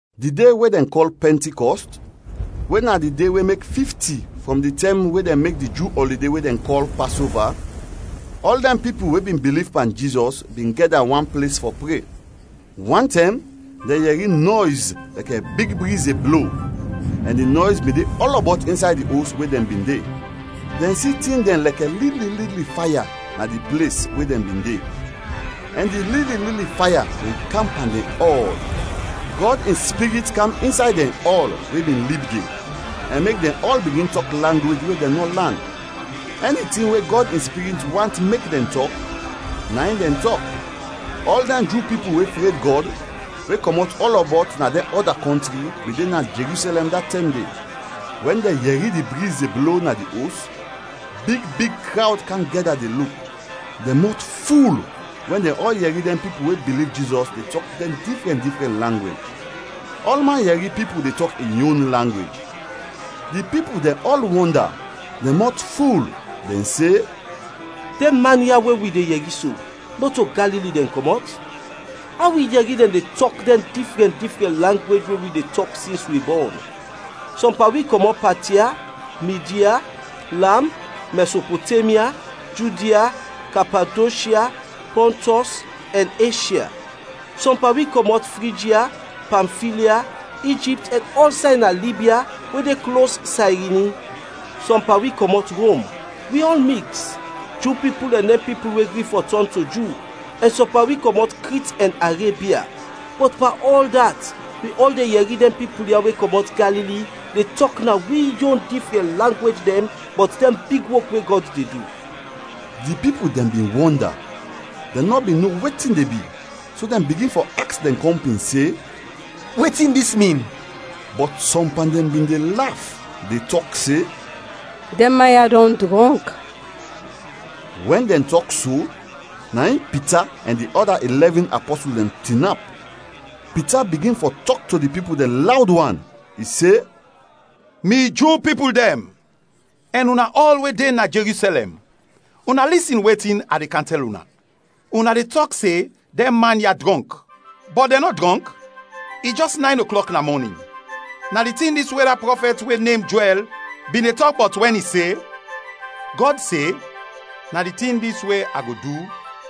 Di de we dɛn kɔl Pɛntikɔst, we na di de we mek fifti frɔm di tɛm we dɛn mek di Ju ɔlide we dɛn kɔl Pasova, ɔl dɛn pipul we bin biliv pan Jizɔs bin gɛda wan ples fɔ pre. Wantɛm, dɛn yɛri nɔys lɛkɛ big briz de blo ɛn di nɔys bin de ɔlɔbɔt insay di os we dɛn bin de. Dɛn si tin dɛn lɛkɛ lili lili faya na di ples we dɛn bin de, ɛn di lili lili faya dɛn kam pan dɛn ɔl. Gɔd in Spirit kam insay dɛn ɔl we bin lib de ɛn mek dɛn ɔl bigin tɔk langwej we dɛn nɔ lan; ɛni tin we Gɔd in Spirit want mek dɛn tɔk, na in dɛn tɔk. Ɔl dɛn Ju pipul we fred Gɔd, we kɔmɔt ɔlɔbɔt na dɛn ɔda kɔntri, bin de na Jerusɛlɛm da tɛm de. Wɛn dɛn yɛri di briz de blo na di os, big big krawd kam gɛda de luk; dɛn mɔt ful wɛn dɛn ɔl yɛri dɛn pipul we biliv Jizɔs de tɔk dɛn difrɛn difrɛn langwej. Ɔlman yɛri pipul de tɔk in yon langwej. Di pipul dɛn ɔl wɔnda, dɛn mɔt ful; dɛn se, “Dɛn man ya we wi de yɛri so, nɔto Galili dɛn kɔmɔt? Aw wi yɛri dɛn de tɔk dɛn difrɛn difrɛn langwej we wi de tɔk sins wi bɔn? Sɔm pan wi kɔmɔt Patia, Midya, Ilam, Mɛsopotemya, Judia, Kapadoshya, Pɔntɔs, ɛn Eshya. Sɔm pan wi kɔmɔt Frijya, Pamfilya, Ijipt ɛn ɔlsay na Libya we de klos Sayrini; sɔm pan wi kɔmɔt Rom. Wi ɔl miks: Ju pipul ɛn dɛn pipul we gri fɔ tɔn to Ju, ɛn sɔm pan wi kɔmɔt Krit ɛn Arebia; bɔt pan ɔl dat wi ɔl de yɛri dɛn pipul ya we kɔmɔt Galili de tɔk na wi yon difrɛn langwej dɛn bɔt dɛn big wok we Gɔd de du.” Di pipul dɛn bin wɔnda, dɛn nɔ bin no wetin de bi, so dɛn bigin fɔ aks dɛn kɔmpin se, “Wetin dis min?” Bɔt sɔm pan dɛn bin de laf, de tɔk se, “Dɛn man ya dɔn drɔnk!” Wɛn dɛn tɔk so, na in Pita ɛn di ɔda ilɛvin apɔsul dɛn tinap; Pita bigin fɔ tɔk to di pipul dɛn lawd wan. I se, “Mi Ju pipul dɛn ɛn una ɔl we de na Jerusɛlɛm, una lisin wetin a de kam tɛl una. Una de tɔk se dɛn man ya drɔnk, bɔt dɛn nɔ drɔnk, i jɛs nayn oklɔk na mɔnin. Na di tin dis we da prɔfɛt we nem Joɛl bin de tɔk bɔt wɛn i se: ‘Gɔd se, “Na di tin dis we a go du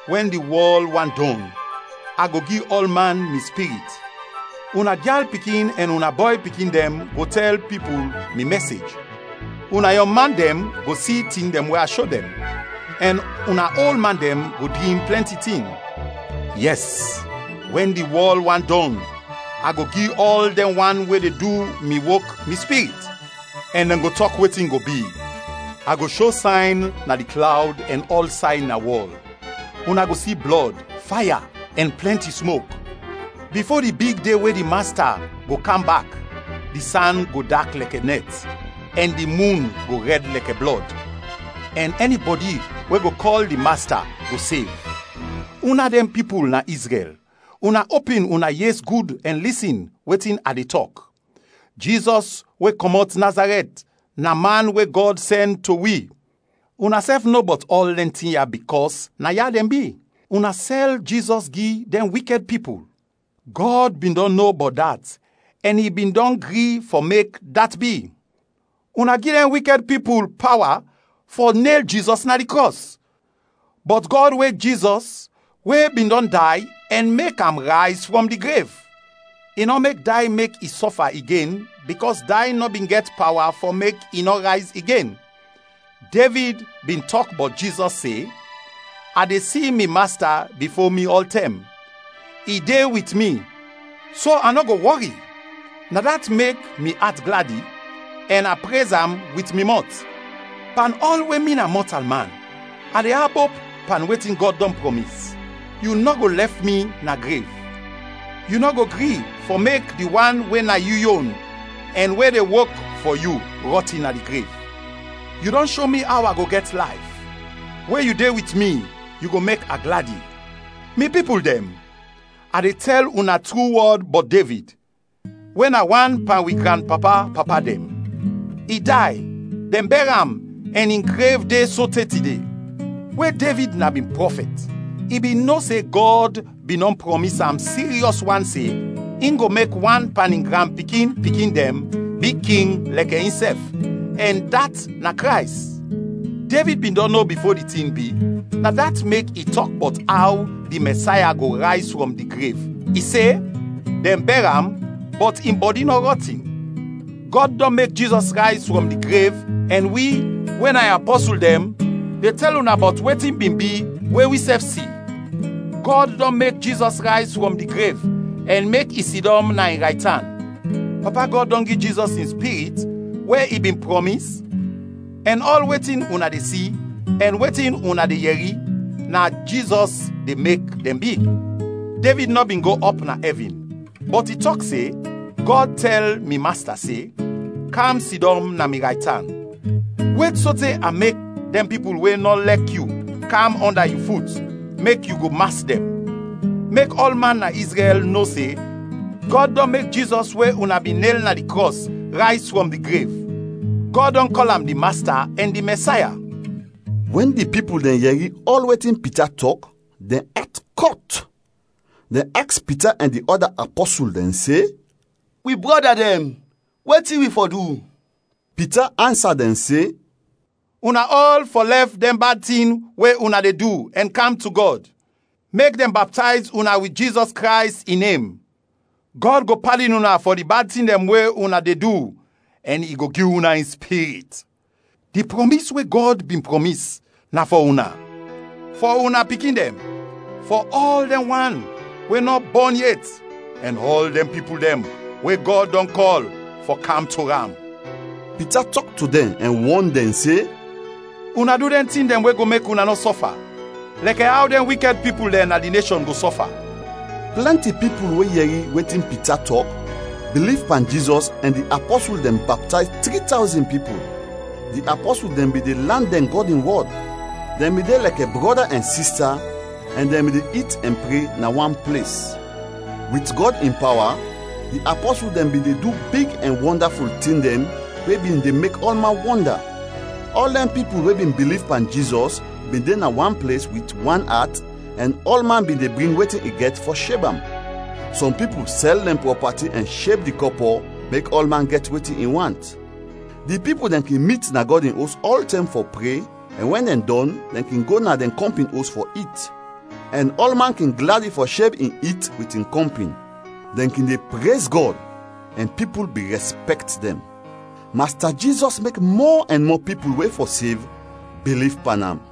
wɛn di wɔl want dɔn, a go gi ɔlman mi Spirit. Una gyal pikin ɛn una bɔy pikin dɛn go tɛl pipul mi mɛsej; una yɔng man dɛn go si tin we a sho dɛn, ɛn una ol man dɛn go drim plɛnti tin. Yɛs, wɛn di wɔl want dɔn, a go gi ɔl dɛn wan we de du mi wok mi Spirit, ɛn dɛn go tɔk wetin go bi. A go sho sayn na di klawd ɛn ɔlsay na wɔl. Una go si blɔd, faya, ɛn plɛnti smok. Bifo di big de we di Masta go kam bak, di san go dak lɛkɛ nɛt ɛn di mun go rɛd lɛkɛ blɔd. Ɛn ɛnibɔdi we go kɔl di Masta go sev.” ’ “Una dɛn pipul na Izrɛl, una opin una yes gud ɛn lisin wetin a de tɔk. Jizɔs we kɔmɔt Nazarɛt na Man we Gɔd sɛn to wi.Unasɛf no bɔt ɔl dɛn tin ya bikɔs naya dɛn bi. Una sɛl Jizɔs gi dɛn wikɛd pipul. Gɔd bin dɔn no bɔt dat ɛn i bin dɔn gri fɔ mek dat bi. Una gi dɛn wikɛd pipul pawa fɔ nel Jizɔs na di krɔs. Bɔt Gɔd wek Jizɔs we bin dɔn day ɛn mek am rayz frɔm di grev; i nɔ mek day mek i sɔfa igen bikɔs day nɔ bin gɛt pawa fɔ mek i nɔ rayz igen. Devid bin tɔk bɔt Jizɔs se, ‘A de si mi Masta bifo mi ɔltɛm; i de wit mi, so a nɔ go wɔri. Na dat mek mi at gladi, ɛn a prez am wit mi mɔt. Pan ɔl we mi na mɔtalman, a de abop pan wetin Gɔd dɔn prɔmis. Yu nɔ go lɛf mi na grev; Yu nɔ go gri fɔ mek di wan we na yu yon ɛn we de wok fɔ yu rɔtin na di grev. Yu dɔn sho mi aw a go gɛt layf. We yu de wit mi, yu go mek a gladi.’ “Mi pipul dɛn, a de tɛl una tru wɔd bɔt Devid, we na wan pan wi granpapa-papa dɛn. I day, dɛn bɛr am ɛn in grev de sote tide. We Devid na bin prɔfɛt, i bin no se Gɔd bin dɔn prɔmis am siryɔs wan se in go mek wan pan in granpikin-pikin dɛn bi king lɛkɛ insɛf, ɛn dat na Krays. Devid bin dɔn no bifo di tin bi, na dat mek i tɔk bɔt aw di Mɛsaya go rayz frɔm di grev, i se, ‘Dɛn bɛr am, bɔt in bɔdi nɔ rɔtin.’ Gɔd dɔn mek Jizɔs rayz frɔm di grev ɛn wi, we na in apɔsul dɛn de tɛl una bɔt wetin bin bi we wisɛf si. Gɔd dɔn mek Jizɔs rayz frɔm di grev ɛn mek i sidɔm na in raytan. Papa Gɔd dɔn gi Jizɔs in Spirit we i bin prɔmis ɛn ɔl wetin una de si ɛn wetin una de yɛri, na Jizɔs de mek dɛn bi. Devid nɔ bin go ɔp na ɛvin, bɔt i tɔk se, ‘Gɔd tɛl mi Masta se, Kam sidɔm na mi raytan wet sote a mek dɛn pipul we nɔ lɛk yu kam ɔnda yu fut mek yu go mas dɛn.’ “Mek ɔlman na Izrɛl no se Gɔd dɔn mek Jizɔs we una bin nel na di krɔs, rayz frɔm di grev. Gɔd dɔn kɔl am di Masta ɛn di Mɛsaya!” Wɛn di pipul dɛn yɛri ɔl wetin Pita tɔk, dɛn at kɔt; dɛn aks Pita ɛn di ɔda apɔsul dɛn se, “Wi brɔda dɛn, wetin wi fɔ du?” Pita ansa dɛn se, “Una ɔl fɔ lɛf dɛn bad tin we una de du ɛn kam to Gɔd. Mek dɛn baptayz una wit Jizɔs Krays in nem; Gɔd go padin una fɔ di bad tin dɛn we una de du ɛn i go gi una in Spirit. Di prɔmis we Gɔd bin prɔmis, na fɔ una, fɔ una pikin dɛn, fɔ ɔl dɛn wan we nɔ bɔn yet, ɛn ɔl dɛn pipul we Gɔd dɔn kɔl fɔ kam to am.” Pita tɔk to dɛn ɛn wɔn dɛn se, “Una du dɛn tin we go mek una nɔ sɔfa, lɛkɛ aw dɛn wikɛd pipul na dis neshɔn go sɔfa.” Plɛnti pipul we yɛri wetin Pita tɔk biliv pan Jizɔs ɛn di apɔsul dɛn baptayz tri tawzin pipul. Di apɔsul dɛn bin de lan dɛn Gɔd in wɔd. Dɛn bin de lɛkɛ brɔda ɛn sista ɛn dɛn bin de it ɛn pre na wan ples. Wit Gɔd in pawa di apɔsul dɛn bin de du big ɛn wɔndaful tin dɛn we bin de mek ɔlman wɔnda. Ɔl dɛn pipul we bin biliv pan Jizɔs bin de na wan ples wit wan at ɛn ɔlman bin de bring wetin i gɛt fɔ sheb am. Sɔm pipul sɛl dɛn prɔpati ɛn sheb di kɔpɔ mek ɔlman gɛt wetin i want. Di pipul dɛn kin mit na Gɔd in Os ɔltɛm fɔ pre ɛn wɛn dɛn dɔn, dɛn kin go na dɛn kɔmpin os fɔ it, ɛn ɔlman kin gladi fɔ sheb in it wit in kɔmpin. Dɛn kin de prez Gɔd, ɛn pipul bin rɛspɛkt dɛn. Masta Jizɔs mek mɔ ɛn mɔ pipul we fɔ sev, biliv pan am.